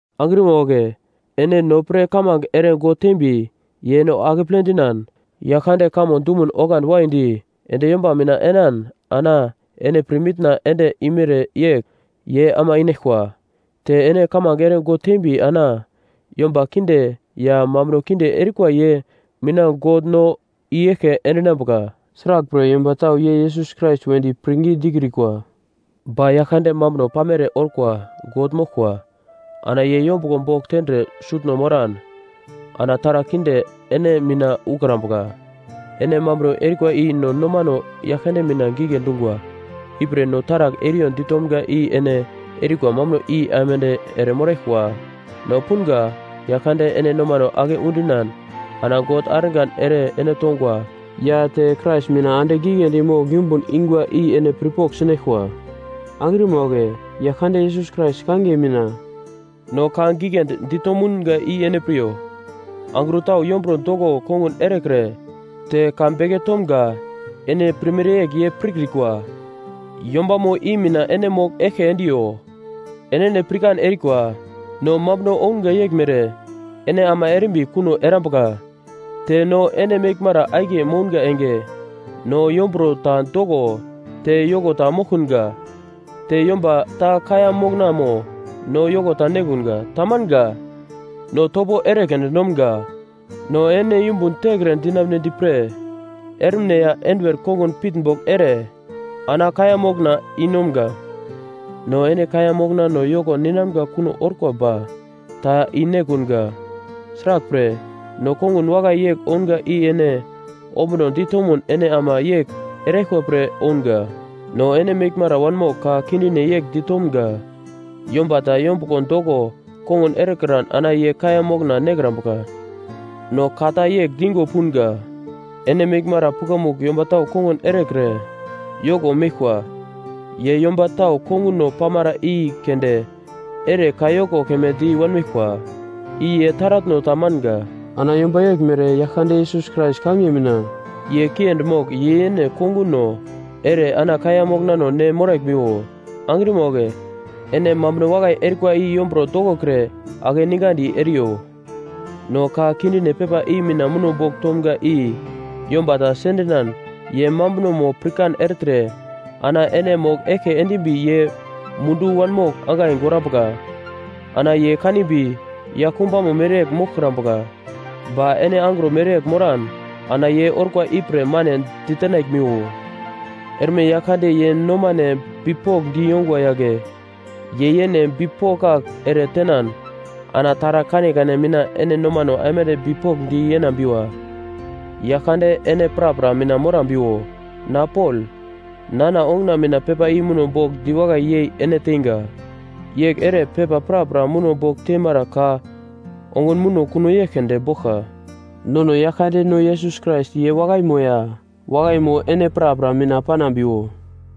Angrima wagle ene no pre kamange ere God tembi ye no akeple dinan Yaglkande kamo dumun oglandi waidi, ende yomba mina enan ana ene pirmitna ende imere yegl ye ama inaglkwa. Te ene kamange ere God tembi ana yomba kinde ya mambuno kinde erikwa ye mina God no i-eglke endinambuka, sraglpre yomba tau ye Yesus Krais wedi pirngi dikrikwa. Ba Yaglkande mambuno pamere orkwa God moglkwa. Ana ye yombuglo bogl tendre sutno moran ana taragl kinde ene mina ukrambuka. Ene mambuno erikwa i no nomano Yaglkande mina gigle dungwa. Ipre no taragl eriyo ditomga i ene erikwa mambuno i aimande ere moraglkwa. No punga Yaglkande ene nomano ake udinan ana God argan ere ene tongwa ya te Krais mina andigl giglendi mogl yumbun ingwa i ene pirpogl sinaglkwa. Angrima wagle, Yaglkande Yesus Krais kangiye mina no ka giglendi dito mounga i ene piryo. Angro tau yomburo doko kongun erekre te ka beke tomga ene pirmere yegl ye pirkrikwa, yombamo i mina ene mogl eglke endiyo. Enene pirkan erikwa, no mambuno ounga yeglmere ene ama erimbi kuno erambuka. Te no ene meglmara akiye mounga enge, no yomburo ta doko te yoko ta moglkunga, te yomba ta kaiya moknamo no yoko ta nekunga. Tamanga, no topo ere keunde nomga no ene yumbun tekre dinamunedi pre ermine ya enduwer kongun pitnbogl ere ana kaiya mokna i-nomga. No ene kaiya moknano yoko ninamga kuno orkwa ba ta i-nekunga, sraglpre no kongun wakai yegl ounga i ene ombunodi tomun ene ama yegl eraglkwa pre ounga. No ene meglmara wanmogl ka kindine yegl di tomga, “Yomba ta yombuglo doko kongun erekran ana ye kaiya mokna nekrambuka.” No ka ta yegl digo punga: Ene meglmara pukamugl yomba tau kongun erekre yoko meglkwa. Ye yomba tau konguno pamara i keunde ere kayoko keme di wanmeglkwa. I ye taratno ta manga. Ana yomba yeglmere Yaglkande Yesus Krais kangiye mina ye kiendi mogl ye yene konguno ere ana kaiya moknano ne moraglmiwo. Angrima wagle, ene mambuno wakai erikwa i yomburo dokokre akeningandi eriyo. No ka kindine pepa i mina muno bogl tomga i yomba ta sendinan ye mambunomo pirkan ertre ana ene mogl eglke endimbi ye mundu wanmogl angai gorambuka. Ana ye kanimbi yaglkumbano mereyegl moglkrambuka, ba ene angro mereyegl moran ana ye orkwa ipre mane ditenaglmiwo. Erme Yaglkande ye nomane bipokndi yongwa yagle ye yene bipokak ere tenan ana taragl kanekane mina ene nomano aimande bipokndi yenambiwa. Yaglkande ene prapra mina morambiwo. Na Pol, nana onguna mina pepa i muno bogl diwakai yei ene teinga. Yegl ere pepa prapra muno bogl teimara ka ongun muno kuno yegl keunde boglka. Nono Yaglkandeno Yesus Krais ye wakaimo ya wakaimo ene prapra mina panambiwo.